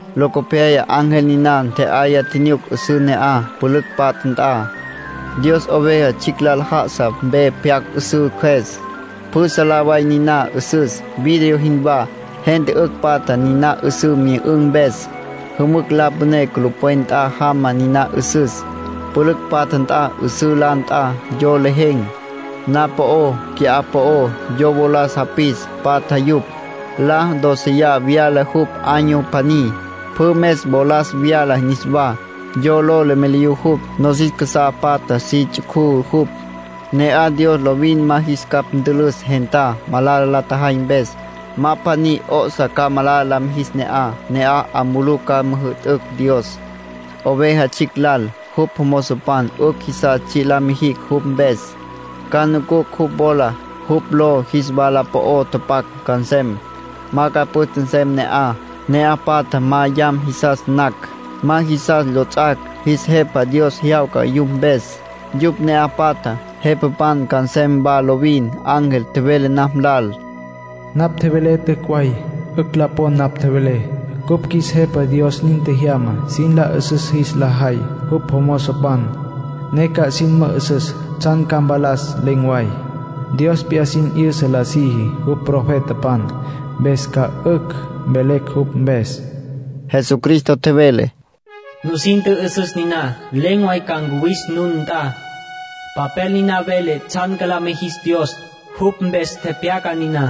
Locopyaya ángel niná ntje'aya tjinyuc 'üsǘ ne'aj, pülücj patja nt'a. Dios Oveja Tsjicj lal já'asa mpe pyacj 'üsǘ cjües. Pjü salá way niná 'üsüs, vidrio jinwá. Gente 'ücj patja niná 'üsǘ myü'ün̈ mpes. Jümücj la püné culupwen nt'a jama niná 'üsüs, pülücj patja nt'a. 'Üsǘ la nt'a, yo lejen̈, na'aj po'ó, qui'á po'ó. Yo wolas japis, patja yupj. La dóceya vyala jupj año pjaní. Pjü mes wolas vyala niswá. Yo lo lemeliyú jupj, nosis casá patja si ts'ucú jupj. Ne'aj Dios lovin ma jis capj ntülüs gentá, malala la tjajay mpes. Ma pjaní 'o'sa ca malala la mijis ne'aj. Ne'aj 'a mulú ca müjü'tücj Dios, Oveja Tsjicj lal. Jupj jomozopan 'ücj jisas tsji' la mijicj jupj mpes. Ca nucucj jupj wola. Jupj ló jis wala po'o tapac ca nsem. Ma ca püste nsem ne'aj. Ne'aj patjá ma yam jisas nacj, ma jisas lots'ac'. Jis Jepa Dios jyawca yupj mpes. Yupj ne'aj patjá, jepapan ca nsem wa lovin. Ángel tjevele napj lal: “Napj tjevelé t'üc' way. 'Ücj la pon napj tjevelé. Cupj qjuis Jepa Dios nin tjejyama sin la 'üsüs jis la jay jupj jomozopan, ne ca sin mü'üsüs tsjan ca mpalas len̈ way. Dios p'iyá sin 'yüsa la siji jupj profetapan, mpes ca 'ücj mvelecj jupj mpes.” Jesucristo tjevele: “Nusin tjü'üsüs niná. Len̈ way ca ncuwis nun nt'a. Papel niná vele tsjan ca la mijis Dios. Jupj mpes tepyaca niná.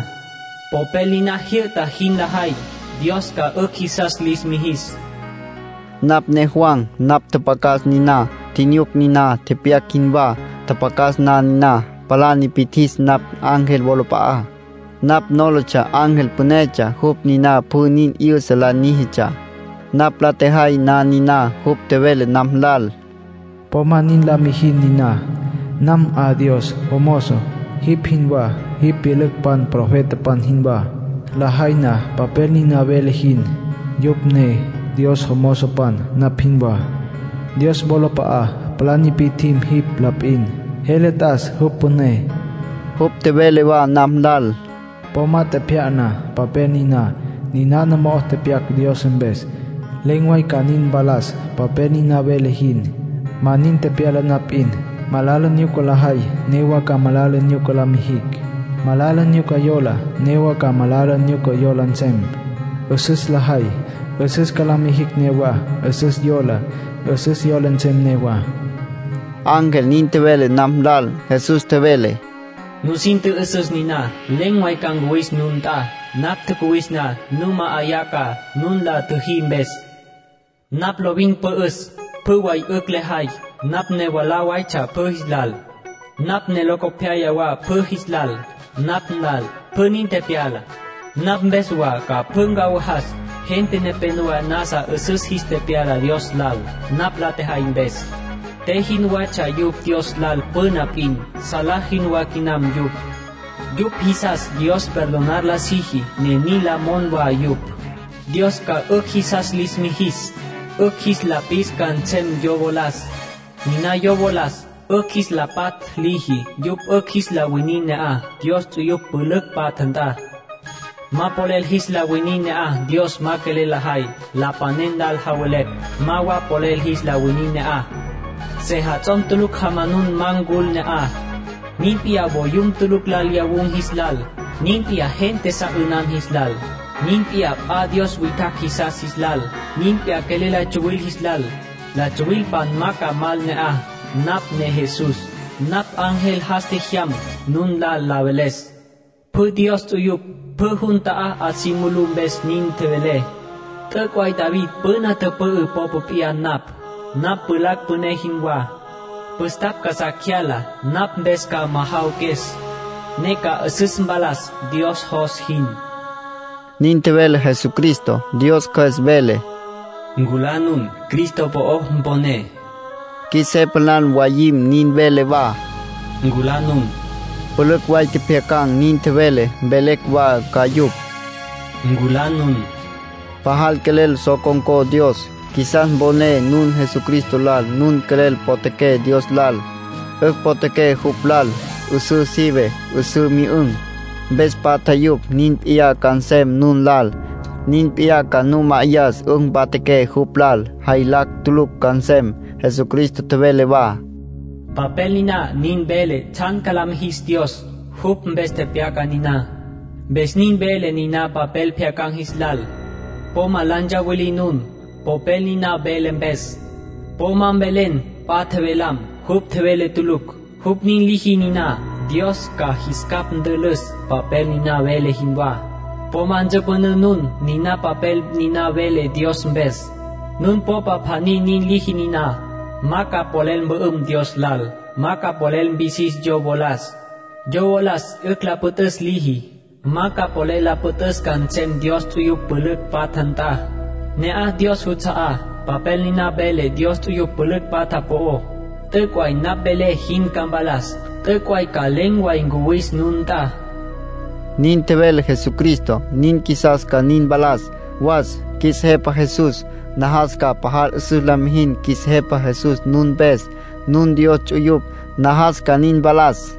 Popel niná jyü'ta jin lajay, Dios ca 'ücj jisas lis mijis”, nin tjevele Jesucristá. Napj ne Juan. Napj tjapjacas niná, tjinyuc niná, tepyac jinwá. Tjapjacas na niná, palá nipi'tjis napj ángel wolap'a'á. Napj nólatsja ángel pünetsja. Jupj niná pjü nin 'yüsa la níjitsja. Napj la tjejay na niná, jupj tjevele napj lal: “Po ma nin la mijin niná. Nam 'a Dios jomozo, jipj jinwá, jipj pyülücpan profetapan jinwá. Lajay na papel niná vele jin, yupj ne Dios jomozopan, napj jinwá. Dios wolap'a'a palá nipi'tjim jipj la p'in. Jele t'as jupj püné.” Jupj tjevele wa napj lal: “Po ma tjepjya'na papel niná, ninana mo'ó tepyac Dios mpes. Len̈ way ca nin mpalas papel niná vele jin. Ma nin tepyala na p'in, malala nyuca lajay newa ca malala nyuca la mijicj. Malala nyuca yola, newa ca malala nyuca yola nsem. 'Üsüs lajay, 'üsüs ca la mijicj newá. 'Üsüs yolá, 'üsüs yola nsem newá”, ángel nin tjevele napj lal. Jesús tjevele: “Nusin tjü'üsüs niná. Len̈ way ca ncuwis nun nt'a. Napj tjacuwis na, nu ma'ayá ca, nun la tjüjí mpes. Napj lovin pü'üs, pjü way 'ücj lejay. Napj ne mwalá waytsja pjü jis lal. Napj ne locopyaya wa pjü jis lal. Napj nlal pjü nin tepyala. Napj mpes wa ca pjü ncawajas. Gente nepénowa nasa 'üsüs jis tepyala Dios lal, napj la tjejay mpes. Te jinwatsja yupj Dios lal püna p'in; salá jinwá quinam yupj. Yupj jisas Dios perdonar la siji, ne nin la mon wa yupj. Dios ca 'ücj jisas lis mijis. 'Ücj jis la pis ca nsem yo wolas, niná yo wolas 'ücj jis la patj liji. Yupj 'ücj jis la winin ne'aj, Dios ts'uyupj pülücj patja nt'a. Ma polel jis la winin ne'aj Dios ma quelel lajay. Lapanen lal javelepj, ma wa polel jis la winin ne'aj. Sejats'om tulucj jamanun ma ncul ne'aj. Nin p'iyá voyum tulucj lal lyawun̈ jis lal. Nin p'iyá gente sa 'ünan jis lal. Nin p'iyá p'a dios witjacj jisas jis lal. Nin p'iyá quelel la tsuwil jis lal. La tsuwilpan ma ca mal ne'aj. ”Napj ne Jesús. Napj ángel jas tjejyam, nun lal la veles. Pjü Dios ts'uyupj pjü jun ta'á 'a si mulú mpes nin tjevelé. T'üc' way David püna tüpü'ü popa p'iyá napj. Napj pjulacj püné jinwá, püstapj casá cyala. Napj mpes ca majawaques, ne ca 'üsüs mpalas Dios jos jin”, nin tjevele Jesucristo. Dios Cjües vele: “Nculá nun. Jesucristo po'o mponé.” Qjuis Jepa lal mwayim nin vele wa: “Nculá nun”. Pülücj way tjepjyacan̈ nin tjevelé; mvelecj wa ca yupj: “Nculá nun”. Pajal quelel so con̈có Dios, qjuisas mponé nun Jesucristo lal. Nun quelel potjaqué Dios lal, 'ücj potjaqué jupj lal. 'Üsǘ sive, 'üsǘ myü'ün̈, mpes patja yupj. Nin p'iyá ca nsem nun lal. Nin p'iyá ca nu ma'ayas 'ücj mpatjaqué jupj lal. Jaylacj tulucj ca nsem. Jesucristo tjevele wa: “Papel niná nin vele tsjan ca la mijis Dios. Jupj mpes tepyaca niná. Mpes nin velé niná papel pjyacan̈ jis lal: po ma la ntsawilí nun, popel niná vele mpes. Po ma mvelé p'a tjevelam, jupj tjevele tulucj. Jupj nin liji niná, Dios ca cus ntülüs papel niná vele jinwá. Po ma ntsüpünǘ nun niná papel niná vele Dios mpes. Nun popa pjaní nin liji niná, ma ca polel mpü'üm Dios lal. Ma ca polel mpisis yo wolas, yo wolas 'ücj la püt'üs liji. Ma ca polel la püt'üs ca nsem Dios ts'uyupj pülücj patja nt'a, ne'aj Dios juts'a'á. Papel niná vele Dios ts'uyupj pülücj patja po'ó. T'üc' way napj velé jin ca mpalas. T'üc' way ca len̈ way ncuwis nun nt'a”, nin tjevele Jesucristo. Nin qjuisas ca nin mpalas. Was, qjuis Jepa Jesús. Najas ca pajal 'üsüs la mijis qjuis Jepa Jesús nun mpes. Nun Dios juts'uyupj. Najas ca nin mpalas.